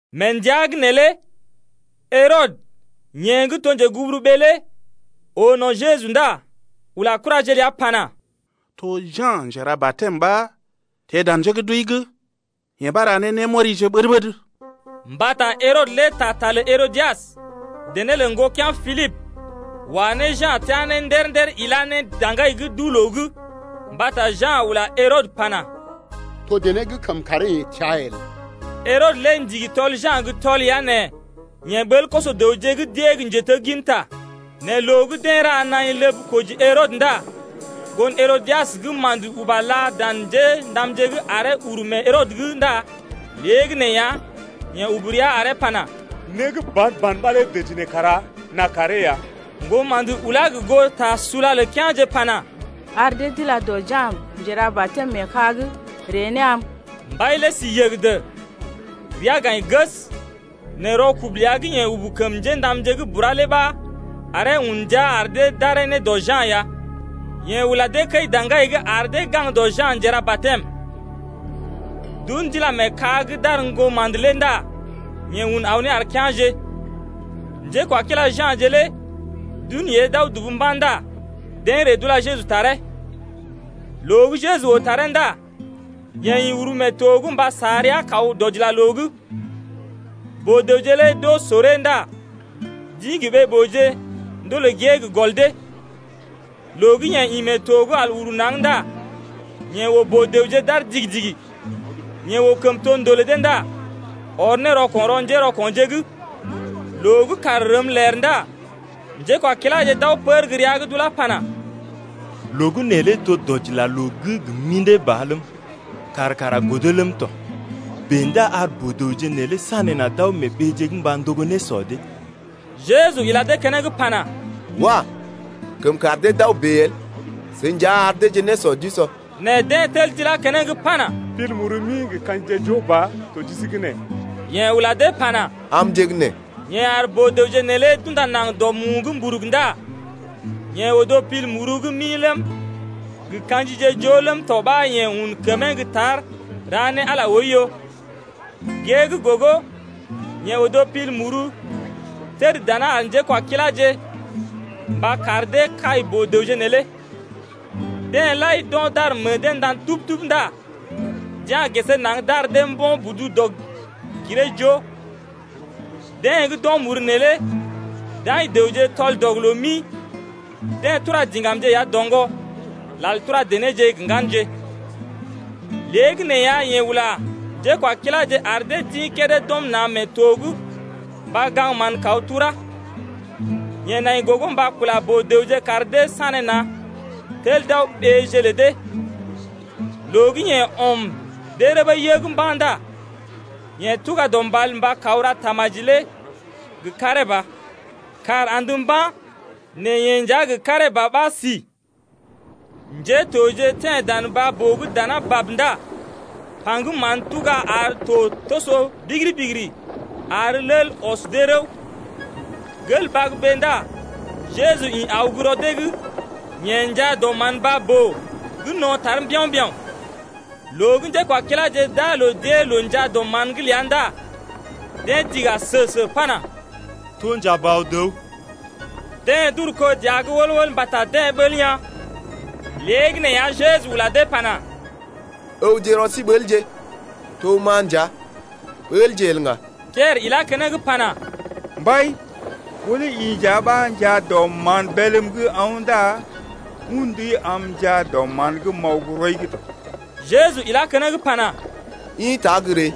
Mee ndəa’g neelé Herɔdə, yeḛ gə́ to njeguburuɓee lé oo no̰ Jeju lé ndá ula kuraje ləa pana: To Ja̰ Njera-batɛm ɓa teḛ dan njé gə́ d’wəi’g, yee ɓa ra ne némɔrije ɓəd-ɓəd. Mbata Herɔdə lé taa ta lə Herodias, dené lə ŋgokea̰ Pilibə wa ne Ja̰ teá ne ndər-ndər ilá ne daŋgai’g duu-loo’g. Mbata Ja̰ ula Herɔdə pana: To dené gə́ kəm karee-yeḛ təa el. Herɔdə lé ndigi tɔl Ja̰ gə́ tɔl ya nɛ yeḛ ɓəl koso-dəwje gə́ d’ée gə́ njetegginta lé. Nɛ loo gə́ deḛ ra naḭ ləb koji Herɔdə lé ndá ŋgon Herodias gə́ ma̰də uba là dan njéndamje’g aree uru mee Herɔdə’g ndá léegəneeya, yeḛ ubu rəa aree pana: Né gə́ ban-ban ɓa lé dəji neḛ kara n’a karee ya. Ŋgoma̰də lé ulá gə goo ta sula lə kea̰je pana: Ar dee d’ila dɔ Ja̰ Njera-batɛm mee ka’g d’ari ree ne am. Mbai lé si yəgədə, rəa gaḭ ges, nɛ rɔkubu ləa gə́ yeḛ ubu kəm njéndamje’g bura lé ɓa aree un ne ndia ar dee d’aree ne dɔ Ja̰ ya. Yeḛ ula dee kəi-daŋgai’g ar dee gaŋg dɔ Ja̰ Njera-batɛm lé. D’un d’ila mee ka’g d’ar ŋgoma̰də lé ndá yeḛ un aw ne ar kea̰je tɔ. Njékwakila Ja̰je lé d’un yée d’aw dubu mba̰ ndá deḛ ree d’ula Jeju taree. Loo gə́ Jeju oo taree ndá yeḛ ḭ uru mee to’g mba sa rəa kaw dɔdilaloo’g. Boo-dəwje lé d’oo soree ndá d’ḭ gə ɓee-booje ndolè gée gə gɔl dee. Loo gə́ yeḛ ḭ mee to’g al uru naŋg ndá yeḛ oo boo-dəwje d’aar digi-digi. Yeḛ oo kəmtondoo lə dee ndá ɔr ne rɔko̰ rɔ njérɔko̰je’g. Loo gə́ kàr rəm ler ndá njékwakiláje d’aw pər gə́ rəa’g d’ulá pana: Loo gə́ neelé to dɔdilaloo’g gə mḭdé ba ləm, kàr kara godo ləm tɔ. Bèe ndá ar boo-dəwje nee sanéna̰ d’aw mee ɓeeje’g mba ndogo nésɔ dee. Jeju ila dee keneŋ pana: Wah! kəm kar dee d’aw bèe el. Seḭ nja ar deeje nésɔ d’usɔ. Nɛ deḛ tel d’ilá keneŋ pana, Pil muru mi gə ka̰jije joo ba to ji sí’g nee. Yeḛ ula dee pana: Amje gə́ nee. Yeḛ ar boo-dəwje neelé d’unda naŋg dɔ mu’g mburug ndá yeḛ odo pil muru gə́ mi ləm gə ka̰jije joo ləm tɔ ɓa yeḛ un kəmee gə́ tar ra ne Ala lé oiyo. Gée gə́ gogo yeḛ odo pil muru təd dana ar njékwakiláje mba kar dee kai boo-dəwje neelé. Deḛ lai d’o̰ d’ar meḛ dee ndan tub-tub ndá d’ya̰ gesee naŋg d’ar dee mbo̰ budu dɔg-giree-joo. Deḛ gə́ d’o̰ muru neelé d’aḭ dəwje tɔl-dɔg-loo-mi. Deḛ tura diŋgamje ya doŋgɔ, lal tura denéje gə ŋganje. Léegəneeya yeḛ ula njékwakiláje ar dee d’ḭ kédé d’ɔm na̰ mee to’g mba gaŋg mán kaw turá. Yeḛ nai gogo mba kula boo-dəwje kar dee sanéna̰ tel d’aw ɓéeje lə dee. Loo gə́ yeḛ ɔm dee rəbə yəg mba̰ ndá yeḛ tuga dɔ mbal mba kaw ra tamaji lé gə karee ba. Kàr andə mba̰ nɛ yeḛ nja gə karee ba ɓa si. Njétoje teḛ dan baa-boo’g dana bab ndá paŋgəm mán tuga ar to toso bigiri-bigiri ar lel ɔs dee rəw. Gel bagbee ndá Jeju ḭ aw gə́ rɔ dee’g, yeḛ njaa dɔ mán baa-boo gə́ no̰ tar mbiao̰-mbiao̰ lé. Loo gə́ njékwakiláje d’aa loo d’ée loo njaa dɔ mán’g ləa ndá deḛ dḭga sə-sə pana: To njabaw-dəw. Deḛ d’uru kó dəa’g wəl-wəl mbata deḛ ɓəl yaa̰. Léegəneeya Jeju ula dee pana: Ǝwje rɔ sí ɓəlje, to ma nja. Ɓəlje el ŋga. Piɛrə ilá keneŋ pana: Mbai, ɓó lé i nja ɓa njaa dɔ mán bélm’g aw’n ndá un ndui am m’njaa dɔ mán’g m’aw gə́ rɔi’g tɔ. Jeju ilá keneŋ pana: Ḭta, gə́ ree!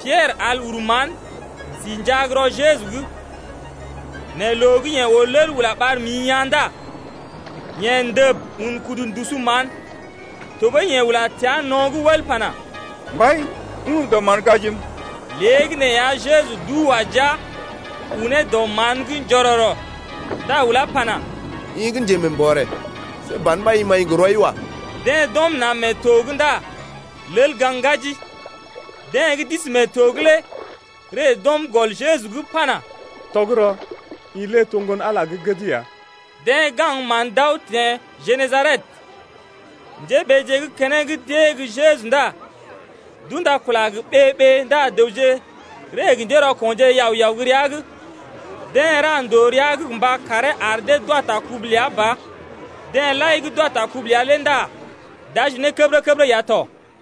Piɛrə al uru mán, si njaa gə́ rɔ Jeju’g lé. Nɛ loo gə́ yeḛ oo lel ula ɓar mḭ yaa̰ ndá yeḛ ndəb un kudu ndusu mán tɔɓəi yeḛ ula təa no̰’g wəl pana: Mbai, ajim. Léegəneeya, Jeju duu wa jia unee dɔ mán’g njororo ndá ulá pana: I gə́ njemeembɔrè, see ban ɓa i maḭ gə rɔi wa. Deḛ d’ɔm na̰ mee to’g ndá lel gaŋg ŋgaji. Deḛ gə́ d’isi mee to’g lé ree d’ɔm gɔl Jeju’g pana: Tɔgərɔ, i lé to Ŋgon-Ala gə́ gəd ya. Deḛ gaŋg mán d’aw teḛ Genesaret. Njéɓeeje gə́ keneŋ d’ée gə́ Jeju ndá d’ula kula gə ɓee-ɓee ndá dəwje ree gə njérɔko̰je yao-yao gə́ rəa’g. Deḛ ra ndòo rəa’g gə mba karee ar dee d’wa ta kubu ləa ba. Deḛ lai gə́ d’wa ta kubu ləa lé ndá d’aji ne kəbərə-kəbərə ya tɔ.